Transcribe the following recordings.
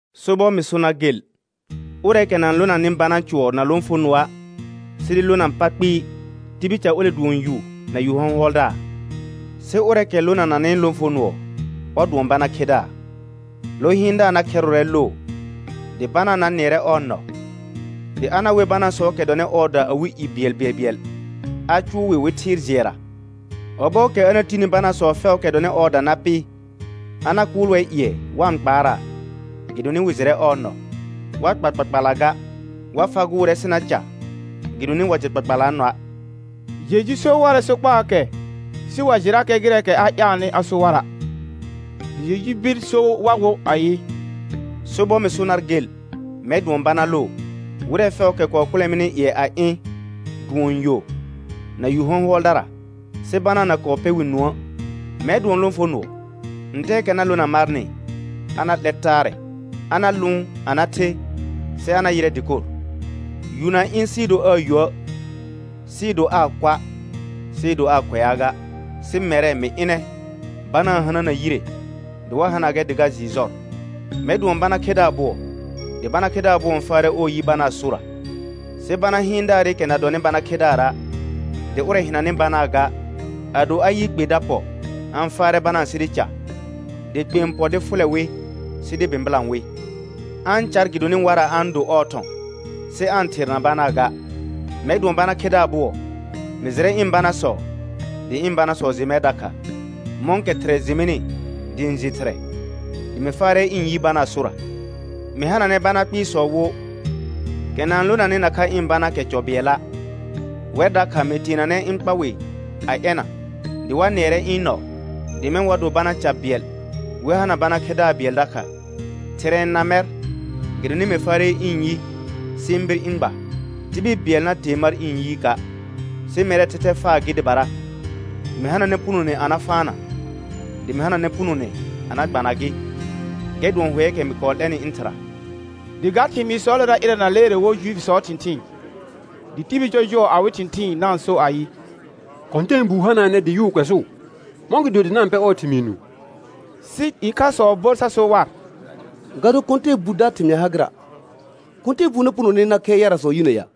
Sobɔr mɩ so nar gel, ʋrɛɛkɛ na-n lonanɩ bana cʋɔr na lõfonʋɔa' sɩ dɩ lona pa kpɩɩ, tibil ca ole dʋɔn yu na yu hɔ̃hʋɔldaar. Sɩ ʋrɛɛkɛ lonananɩ lõfonʋɔ, ɔr dʋɔn bana khedaar. Lo hɩɩndaar na khɛrʋʋrɛ loo, dɩ banaa na nɩɛrɛ ɔɔ nɔ. Dɩ a na wer banaasɔɔkɛ dɔnɩ ɔɔda awɩ i bɩɛlbɩɛlbɩɛl a cʋʋ wɩ wɩ thɩɩr jɩɛra. Ɔbɔɔkɛ a na tini banaasɔ fɛʋʋkɛ dɔnɩ ɔɔda na pɩ, a na kʋʋl wɛr ƴɩɛ wa-n kpaaraa, gɩdonɩ wɩ jɩrɛ ɔɔ nɔ. Wa kpa kpakpalla ga, wa fagʋʋrɛ sɩ na ca gɩdonɩ wa jɩ kpakpalaa nɔa'. Jeju so warɛ sokpaakɛ, sɩ wa jɩrakɛ gɩrɛɛkɛ a ƴaalnɩ a so wara'. Dɩ Jeju bir so war wo ayɩ: Sobɔr mɩ so nar gel, mɛr dʋɔn bana loo. Wɩrɛ fɛʋʋkɛ kɔɔ kʋlɛ mɩnɩ ƴɩɛ a ɩ̃ dʋɔn yo na yu hɔ̃hʋɔldara, sɩ banaa na kɔɔ pɛ wɩ nũə'. Mɛr dʋɔn lõfonʋɔ. Ntɛɛkɛ na lona marnɩ a na 'lɛr taarɛ. A na lʋʋn a na the sɩ a na yɩrɛ dɩkor. Yu na ɩ̃ sɩɩ do aa yuə', sɩɩ do aa kʋa', sɩɩ do aa kʋɛaa ga. Sɩ mɛrɛ, mɩ ɩnɛ banaa n hanana yire dɩ wa hana gɛr dɩ ga jɩɩ jɔr. Mɛr dʋɔn bana khedaar bʋɔ. Dɩ bana khedaar bʋɔ n faarɛ ɔɔ yi banaa sora. Sɩ bana hɩɩndaarɩkɛ na dɔnɩ bana khedaara', dɩ ʋrɛ hɩnanɩ banaa ga, ado a yɩ kpe da pɔ a-n faarɛ banaa sɩ dɩ ca; dɩ kpe n pɔ dɩ fʋlɛ wɩ sɩ dɩ bɩ̃bɩlã wɩ. A-n car gɩdonɩ warra a-n do ɔɔ thɔ̃, sɩ aa-n therna banaa ga. Mɛr dʋɔn bana khedaar bʋɔ. Mɩ jɩrɛ ɩ̃ banasɔ dɩ ɩ̃ banasɔ jɩ mɛr dakha, mɔ̃kɛ Thɩrɛ jɩ mɩnɩ dɩ ɩ̃ jɩ Thɩrɛ. Dɩ mɩ faarɛ ɩ̃ yi banaa sora. Mɩ hananɛ bana kpɩɩsɔ wo, kɛ na-n lonanɩ nakha ɩ̃ banaakɛ cɔ bɩɛlla'. Wɛr dakha mɩ teenanɛ ɩ̃ kpa wɩ a ɛna. Dɩ wa nɩɛrɛ ɩ̃ nɔ, dɩ mɛ̃ wa do bana ca bɩɛl wɩ hana bana khedaar bɩɛl dakha. Thɩrɛ n na mɛr gɩdonɩ mɩ faarɛ ɩ̃ yi sɩ ɩ̃ bir ɩ̃ gba. Tibil bɩɛl na tee mar ɩ̃ yiika', sɩ mɛrɛɛ thɛthɛ faa gɩ dɩbara. Mɩ hananɛ punone a na faana, dɩ mɩ hananɛ punone a na gbana gɩ. Gɛr dʋɔn hʋɛɛkɛ mɩ kɔɔ 'lɛnɩ ɩ̃ Thɩra. Dɩ ga thɩmɩɩsɔɔlera ɩrɛna leere wo Juifisɔɔ thɩ̃thɩɩn. Dɩ tibil jɔjʋɔ awɩ thɩ̃thɩɩn na-n so ayɩ: Kɔ̃tɛɛbuu hanaanɛ, dɩ yʋʋ kʋɛsʋʋ. Mɔ̃gɩdo dɩ na-n pɛ ɔɔ thɩmɩɩ nũu? Sɩ ɩkhasɔ bor sa so war: Ga do kɔ̃tɛɛbuda thɩmɩa ha gɩra'. Kɔ̃tɛɛbuu na punone a na khɛr yarasɔ yinə ya?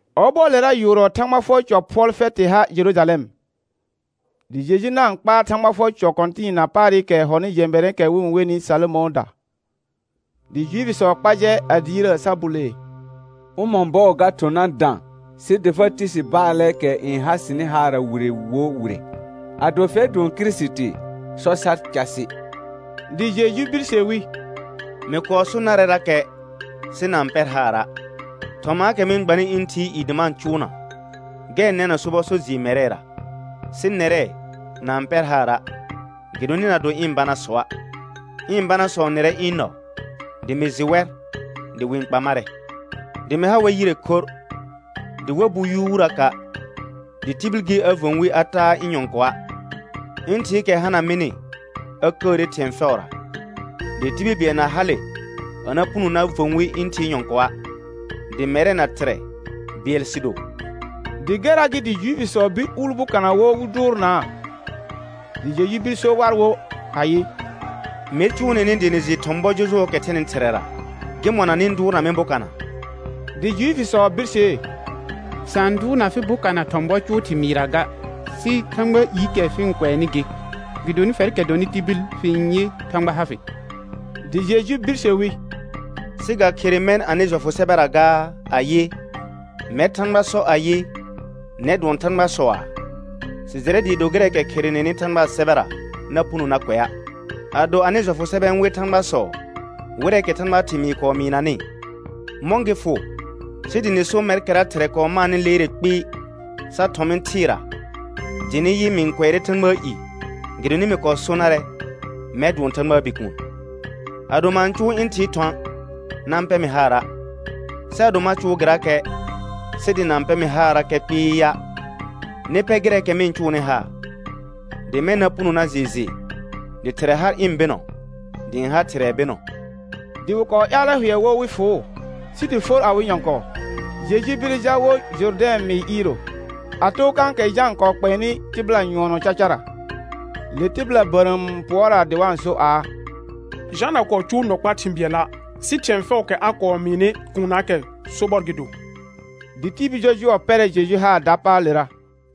Ɔbɔɔlera yʋʋrɔ Thãgba fʋɔr cɔ phʋɔl fɛtɩ ha Jerujalɛm. Dɩ Jeju na-n kpaar Thãgba fʋɔr cɔ kɔ̃tɩɩna paarɩkɛ hɔnɩ jɛ̃bɛrɛ̃ɛkɛ wɩ-n wenɩ Salomɔ̃ɔda. Dɩ Juifisɔ kpa jɛ a diirəə sa bulee: Ʋmɔ̃ bɔɔ ga thʋ̃ na dã sɩ dɩ fa ti si baalɛɛkɛ n ha sɩnɩ haarra wire wo wire? Ado fɛr dʋɔn Kirisiti, sɔ sar casɩ. Dɩ Jeju birse wi: Mɩ kɔɔ so narɛrakɛ sɩ na-n pɛr haara'. Thɔmaakɛ mɩ-n gbanɩ ɩ̃ Thɩɩ i dɩ ma-n cʋʋna, gɛr n nɛna sobɔ so jɩɩr mɛrɛra. Sɩ nɛrɛ, na-n pɛr haara' gɩdonɩ na do ɩ̃ banasɔa'. Ɩ̃ banasɔ n nɩrɛ ɩ̃ nɔ, dɩ mɩ jɩ wɛr dɩ wɩ-n kpa marɛ; dɩ mɩ ha wɛr yire khorr, dɩ wa bu yuuraka', dɩ tibil gɩ a və̃ wi a taa ɩ̃ nyɔ̃kɔa'. Ɩ̃ Thɩɩkɛ hana mɩnɩ a kəəre thɩ̃ɛ fɛʋra, dɩ tibil bɩɛl na hale a na puno na və̃ wi ɩ̃ Thɩɩ nyɔ̃kɔa'. Dɩ mɛrɛ na Thɩrɛ bɩɛl sɩ do. Dɩ gɛrra gɩ dɩ Juifisɔ bir uul bokana wo wɩ dʋʋrnaa. Dɩ Jeju bir so war wo ayɩ: Mer eʋʋ nɩnɩ dɩ nɩ jɩ ɩhɔ̃ bɔ jɔjʋɔsɔɔkɛ thɛnɩ Thɩrɛra, gɩmɔna nɩ-n dʋʋrna mɩ bokana? Dɩ Juifisɔ birsee: Sa n dʋʋrna fɩ bokana thɔ̃ bɔ cʋʋ thɩmɩɩra ga, sɩ Thãgbaa iikɛ fɩ-n kʋɛnɩ gɩ. Gɩdonɩ fɛrkɛ dɔnɩ tibil fɩ-n yɩ Thãgba ha fɩ. Dɩ Jeju birse wi: Sɩ ga khere mɛ̃ anɩ jɔfʋ sɛbɛra gaa ayɩ: «Mɛr Thãgba sɔ ayɩ: Nɛr dʋɔn thãgbasɔaa»? Sɩ jɩrɛ dɩɩ do gɩrɛɛkɛ kherenenɩ Thãgbaa sɛbɛra na puno na kʋɛa', ado anɩ jɔfʋ sɛbɛ n wer thãgbasɔ wɩrɛɛkɛ Thãgbaa thɩmɩɩ kɔɔ mɩɩnanɩ, mɔ̃ gɩ fʋ sɩ dɩ nɩ so mɛrkɛra Thɩrɛ kɔɔ maanɩ leere kpɩɩ sa thɔ̃ mɩ thɩɩra dɩ nɩ yɩ, mɩ-n kʋɛrɛ Thãgbaa i, gɩdonɩ mɩ kɔɔ so narɛ: Mɛr dʋɔn Thãgbaa Bikuun? Ado ma-n cʋʋ ɩ̃ Thɩɩ thɔ̃a', na-n pɛ mɩ haara'. Sɩ ado ma cʋʋ gɩrakɛ sɩ dɩ na-n pɛ mɩ haarrakɛ kpɩɩa', nɩ pɛ gɩrɛɛkɛ mɩ-n cʋʋnɩ haar, dɩ mɛ̃ na puno na jɩɩ jɩ dɩ Thɩrɛ har ɩ̃ bɩnɔ dɩ ɩ̃ ha Thɩrɛɛ bɩnɔ. Dɩ wɩ kɔɔ ƴaalɛ hʋɛ wo wɩ fʋʋ, sɩ dɩ for awɩ nyɔ̃kɔɔ. Jeju bire jal wo Jʋrdɛ̃ mɩɩr iiro, a too kãkɛ Jã n kɔɔ kpɛɛnɩ tɩbɩla nyʋɔnɔ cacara. Le tɩbɩla bərəəm n pʋɔraa dɩ wa-n so aa: Jã na kɔɔ cʋʋ nɔ kpaa thɩ̃ bɩɛla', sɩ thɩ̃ɛ fɛʋʋkɛ a kɔɔ mɩɩnɩ kuunnaakɛ sobɔr gɩ do. Dɩ tibil jɔjʋɔ pɛrɛ Jeju haar dapaalera.